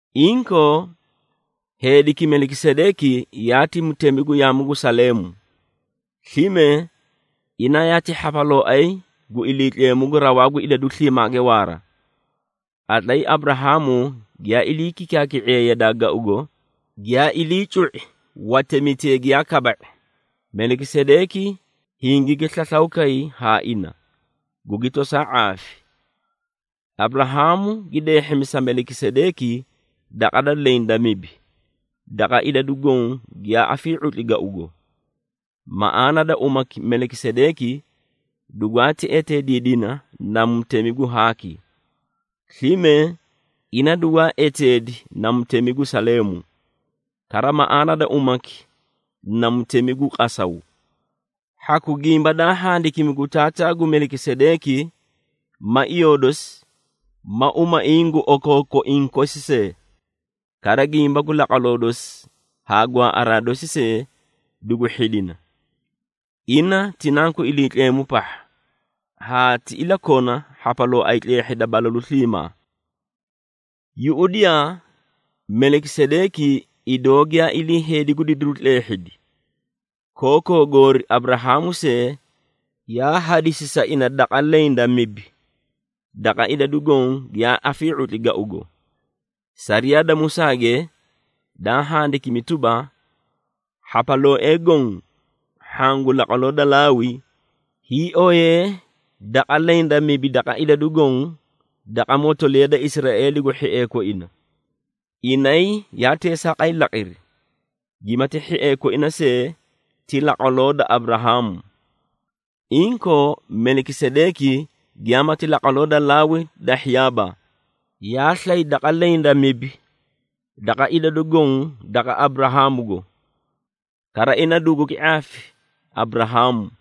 Inkoo, heediki Melikisedeeki yaati mutemi gu yaamu gu Saleemu. Slime, ina yaati hhapalooay gu Iliitleemu gu Rawaa gu Idadu Sliimaage Waara. Qatlay Aburahaamu giyaa ilii kikaaki⁄iye yadaa gaugo, giyaa ilii cu⁄i watemitee giyaa kaba⁄i, Melikisedeeki hingigi slaslaw kay haa ina, gugi tosaa ⁄aafi. Aburahaamu gi deehhimi sa Melikisedeeki daqa leẽ da mibi daqa idadu goõ giyaa afii⁄utli gaugo. Maꞌaana da umaki Melikisedeeki dugwaati eteediidina na “Mutemi gu haaki.” Slime, ina dugwaa eteedi na “Mutemi gu Saleemu,” kara maꞌaana da umaki na “Mutemi gu qasaw.” Hhaku gimba daa handikimi gu taataa gu Melikisedeeki, ma iyoo dosi, ma umaiĩ gu okookoiĩ kosi see. Kara gimba gu laqwaloo dosi haa gwaaꞌaraa dosi see dugu hhidina. Ina ti Nanku Iliitleemu pahha, haa ti ilakona hhapalooay tleehhida balalu sliimaa. Yuꞌudiyaa, Melikisedeeki idoo giyaa ilii heedi gu didiru tleehhidi. Kookoo goori Aburahaamu see yaa hadisi sa ina daqa leẽ da mibi daqa idadu goõ giyaa afii⁄utli gaugo. Sariyaa da Musaage, daa handikimi tuba, hhapalooee goõ hhaã gu laqwaloo da Laawi, hiioyee daqa leẽ da mibi da idadu goõ daqa motoliya da Israeeligo hhiee koina. Inay yaa teesaaqay laqiri, gimati hhiee koina see ti laqwaloo da Aburahaamu. Inkoo, Melikisedeeki giyaamati laqwaloo da Laawi dahhiyaaba, yaa slay daqa leẽ da mibi da idadu goõ daqa Aburahaamugo. Kara ina dugugi ⁄aafi Aburahaamu,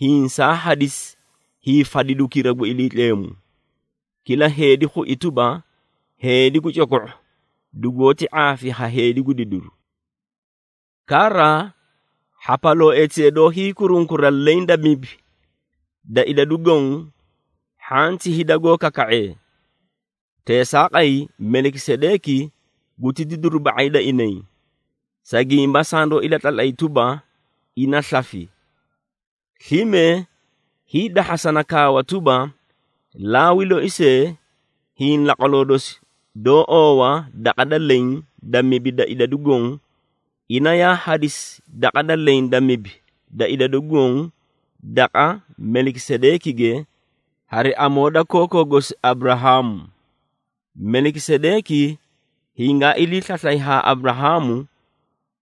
hiĩ saa hadisi hiifadidukira gu Iliitleemu. Kila heedi khui tuba, heedi gu coko⁄u dugoóti ⁄aafi ha heedi gu didiru. Kara, hhapalooetee doó hiikurunkura leẽ da mibi da idadu goõ, hhaã ti hida goó kaka⁄ee. Teesaaqay, Melikisedeeki guti didiru ba⁄ay da inay, sa gimba sandoó ilatlatlay tuba, ina slafi. Slime, hiidahhasana kaawa tuba, Laawi loi see, hiĩ laqwaloo dosi doó oowa daqa da leẽ da mibi da idadu goõ, ina yaa hadisi daqa da leẽ da mibi da idadu goõ daqa Melikisedeekige hari amoo da kookoo gosi Aburahaamu. Melikisedeeki hingaa ilii slaslay haa Aburahaamu,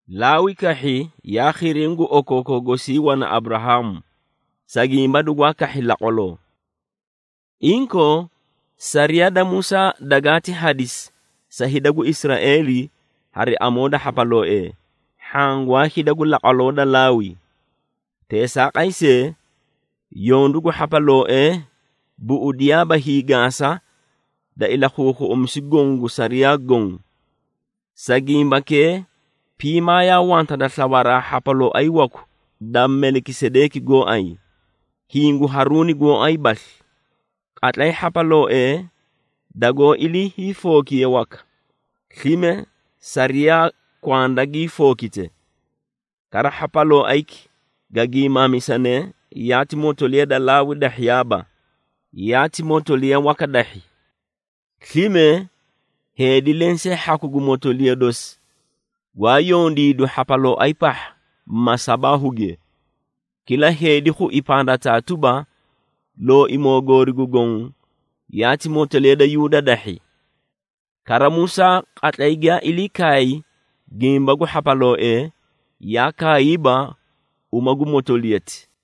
Laawi kahhi yaa khiriĩ gu okookoo gosii wana Aburahaamu, sa gimba dugwaa kahhi laqwaloo. Inkoo, sariyaa da Musaa dagaati hadisi sa hida gu Israeeli hari amoo da hhapalooee, hhaã gwaa hida gu laqwaloo da Laawi. Teesaaqay see, yondu gu hhapalooee buꞌudiyaaba hiigaasa da ilakhuukhuꞌumisu goõ gu sariyaa goõ. Sa gimbakee, piimaa yaa wanta da slawaraa hhapalooay waku da Melikisedeeki gooay, hiĩ gu Haruuni gooay basli. Qatlay hhapalooee dagoó ilii hiifookiye waka, slime sariyaa kwanda gii fookite. Kara, hhapalooayki ga giimaamisane yaati motoliya da Laawi dahhiyaaba, yaati motoliya waka dahhi. Slime, heedi lensee hhaku gu motoliya dosi gwaa yondiidu hhapalooay pahha masabaahuge. Kila heedi khui pandataa tuba, Looimoo goori gu Goõ yaati motoliya da Yuuda dahhi. Kara Musaa qatlay giyaa ilii kaay gimba gu hhapalooee, yaa kaayiiba uma gu motoliyati.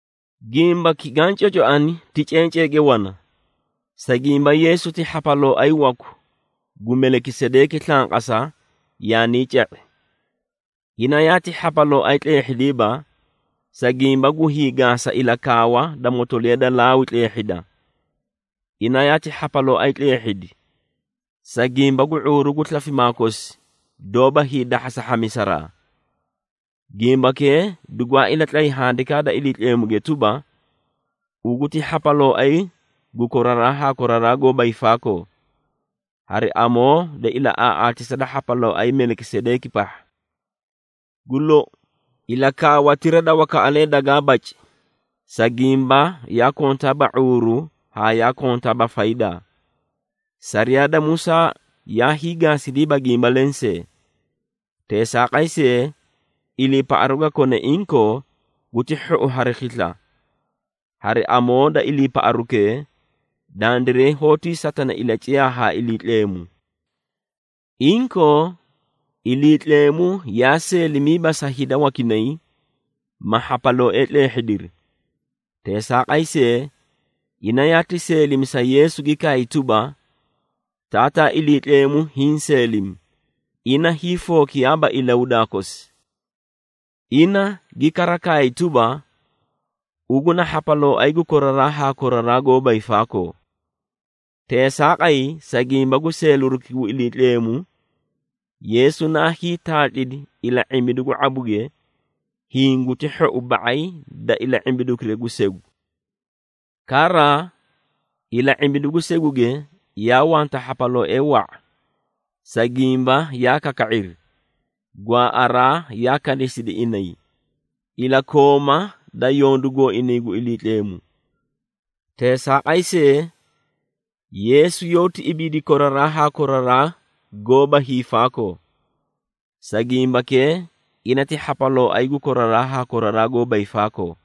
Gimbaki gaã cocoani ti cenceege wana, sa gimba Yeesu ti hhapalooay waku gu Melikisedeeki slanqasa yaanii ca⁄i. Ina yaati hhapalooay tleehhidiiba, sa gimba gu hiigaasa ilakaawa da motoliya da Laawi tleehhida. Ina yaati hhapalooay tleehhidi, sa gimba gu ⁄uuru gu slafimaa kosi doóba hiidahhasa hhamisaraa. Gimbakee dugwaa ilatlay Handikaa da Iliitleemuge tuba, “Ugu ti hhapalooay gu koraraa haa koraraa goóba hiifaakoo, hari amoo da ilaꞌaaꞌaatisa da hhapalooay Melikisedeeki pahha.” Gu lou, ilakaawatira da wakaꞌalee dagaa baci, sa gimba yaa kontaaba ⁄uuru haa yaa kontaaba faydaa. Sariyaa da Musaa yaa hiigaasidiiba gimba lensee. Teesaaqay see, iliipaꞌaru ga kone inkoo guti hhou hari khisla. Hari amoo da iliipaꞌarukee, dandiray hoótii satana ilaciyaa haa Iliitleemu. Inkoo, Iliitleemu yaa seelimiiba sa hida wakinay, ma hhapalooee tleehhidiri. Teesaaqay see, ina yaati seelimi sa Yeesu gi kaay tuba, “Taataa Iliitleemu hiĩ seelimi, ina hiifookiyaaba ilahudaa kosi.” Ina gi kara kaay tuba, “Ugu na hhapalooay gu koraraa haa koraraa goóba hiifaakoo.” Teesaaqay, sa gimba gu seeliruki gu Iliitleemu, Yeesu naa hiitaatlidi ila⁄imbidu gu ⁄abuge, hiĩ guti hhou ba⁄ay da ila⁄imbidukira gu segu. Kara, ila⁄imbidu gu seguge yaa wanta hhapalooee wa⁄a, sa gimba yaa kaka⁄iri, gwaaꞌaraa yaa kanisidi inay, ilakooma da yondu gooinay gu Iliitleemu. Teesaaqay see, Yeesu yoóti ibiidi koraraa haa koraraa goóba hiifaakoo, sa gimbakee ina ti hhapalooay gu koraraa haa koraraa goóba hiifaakoo.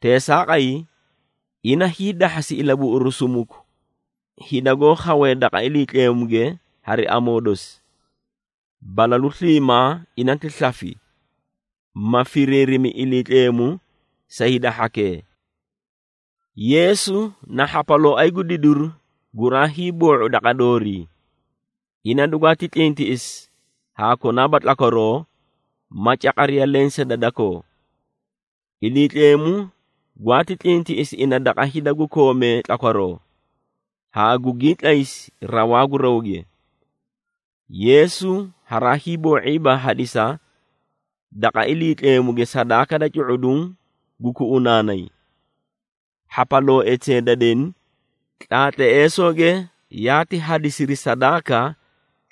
Teesaaqay, ina hiidahhasi ilabuꞌuru sumuku hida goó khawee daqa Iliitleemuge hari amoo dosi. Balalu sliimaa ina ti slafi, ma firiirimi Iliitleemu sa hida hhakee. Yeesu na hhapalooay gu didiru guraa hiiboo⁄u daqa doorii. Ina dugwaati tlintiꞌisi haa konaaba tlakwaroo ma caqariya lensee da dakoo. Iliitleemu gwaati tlintiꞌisi ina daqa hida gu koomee tlakwaroo, haa gugii tlaysi rawaa gu rawge. Yeesu haraa hiiboo⁄iiba hadisa daqa Iliitleemuge sadaaka da cu⁄uduũ gu kuꞌunaanay. Hhapalooetee da deni, tlaatleesooge yaati hadisiri sadaaka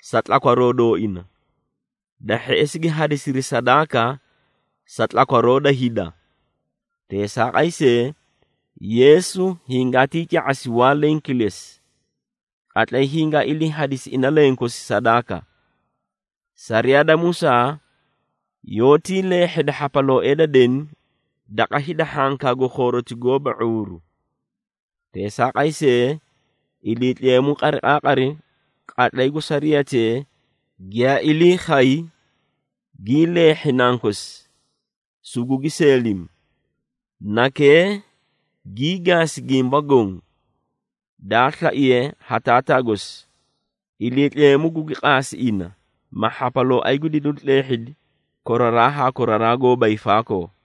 sa tlakwaroo dooina. Da hheꞌesi gi hadisiri sadaaka sa tlakwaroo da hida. Teesaaqay see, Yeesu hingaatii ca⁄asi waa leẽ kilesi, qatlay hingaa ilii hadisi ina lenkosi sadaaka. Sariyaa da Musaa yoótii leehheda hhapalooee da deni daqa hida hhankaa gu khooroti gooba ⁄uuru. Teesaaqay see, Iliitleemu qariqaaqari qatlay gu sariyatee giyaa ilii khay, gii leehhi Nankosi, sugugi seelimi. Nakee gii gaasi gimba goõ, daa slaiye ha Taataa gosi. Iliitleemu gugi qaasi ina, ma hhapalooay gu didiru tleehhidi koraraa haa koraraa goóba hiifaakoo.